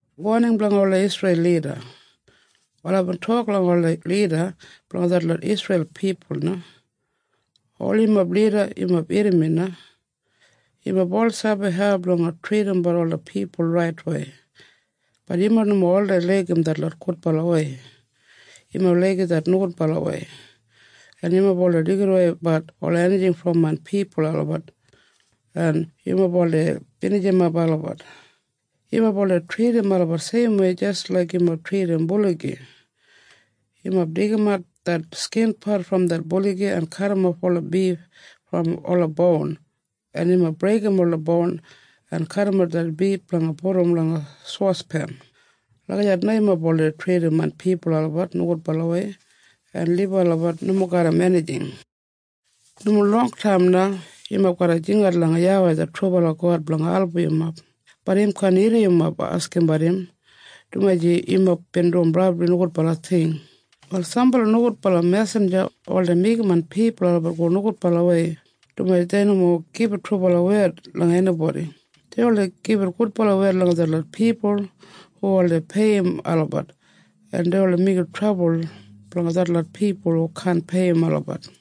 Wal aibin tok langa ola lida blanga detlot Isreil pipul na, “Ol yumob lida, yumob irrim mi na. Yumob ol sabi hau blanga tridimbat ola pipul raitwei. Bat yumob nomo oldei laigim det gudbalawei. Yumob laigim det nogudbalawei, en yumob oldei deigidaweibat ola enijing brom main pipul olabat, en yumob oldei binijimap olabat. Yumob oldei tridim olabat seimwei jis laik yumob tridim buligi. Yumob deigimat det skinpat brom det buligi en kadimof ola bif brom ola boun, en yumob breigim ola boun en kadimap det bif blanga pudum langa sospen. Lagijat na yumob oldei tridim main pipul olabat nogudbalawei en libum olabat nomo garram enijing. “Nomo longtaim na yumob garra jingat langa YAWEI det trubala God blanga album yumob. Bat im kaan irrim yumob askimbat im, dumaji yumob bin dum brabli nogudbala ting. “Wal sambala nogudbala mesinja oldei meigim main pipul olabat go nogudbalawei, dumaji dei nomo gibit trubala wed langa enibodi. Dei oldei gibit gudbala wed langa detlot pipul hu oldei peiyim olabat, en dei oldei meigim trabul blanga detlot pipul hu kaan peiyim olabat.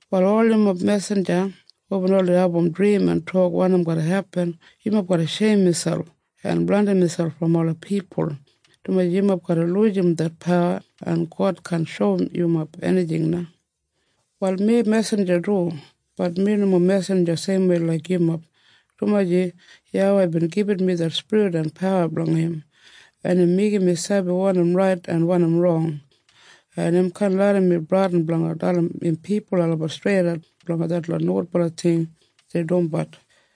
“Wal ol yumob mesinja hubin oldei abum drim en tok wanim garra hepin, yumob garra sheim miselp en blandim miselp brom ola pipul, dumaji yumob garra lujim det pawa, en God kaan shoum yumob enijing na. “Wal mi mesinja du. Bat mi nomo mesinja seimwei laik yumob, dumaji YAWEI bin gibit mi det spirit en pawa blanga im, en im meigim mi sabi wanim rait en wanim rong, en im kaan larram mi bradin blanga dalim im pipul olabat streidat blanga detlot nogudbala ting dei dumbat.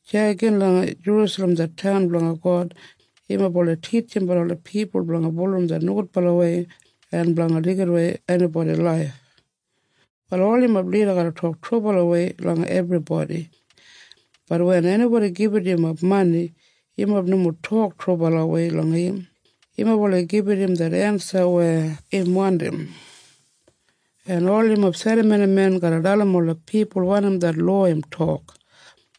Deya gin langa Jerusalem det taun blanga God yumob oldei titjimbat ola pipul blanga bulurrum det nogudbalawei en blanga deigidawei enibodi laif. “Wal ol yumob lida garra tok trubalawei langa ebribodi. Bat wen enibodi gibit yumob mani, yumob nomo tok trubalawei langa im. Yumob oldei gibit im det ensa weya im wandim. En ol yumob serramonimen garra dalim ola pipul wanim det lowa im tok.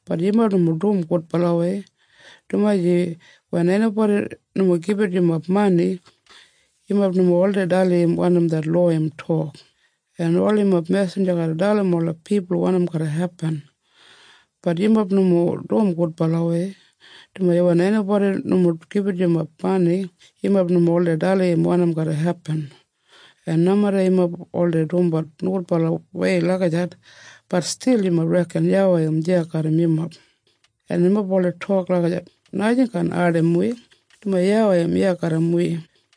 Bat yumob nomo dum gudbalawei, dumaji wen enibodi nomo gibit yumob mani, yumob nomo oldei dalim im wanim det lowa im tok. En ol yumob mesinja garra dalim ola pipul wanim garra hepin. Bat yumob nomo dum gudbalawei, dumaji wen enibodi nomo gibit yumob mani, yumob nomo oldei dalim im wanim garra hepin. En nomeda yumob oldei dumbat nogudbalawei lagijat, bat stil yumob reken YAWEI im deya garram yumob. En yumob oldei tok lagijat, ‘Najing kaan ardim wi, dumaji YAWEI im iya garram wi.’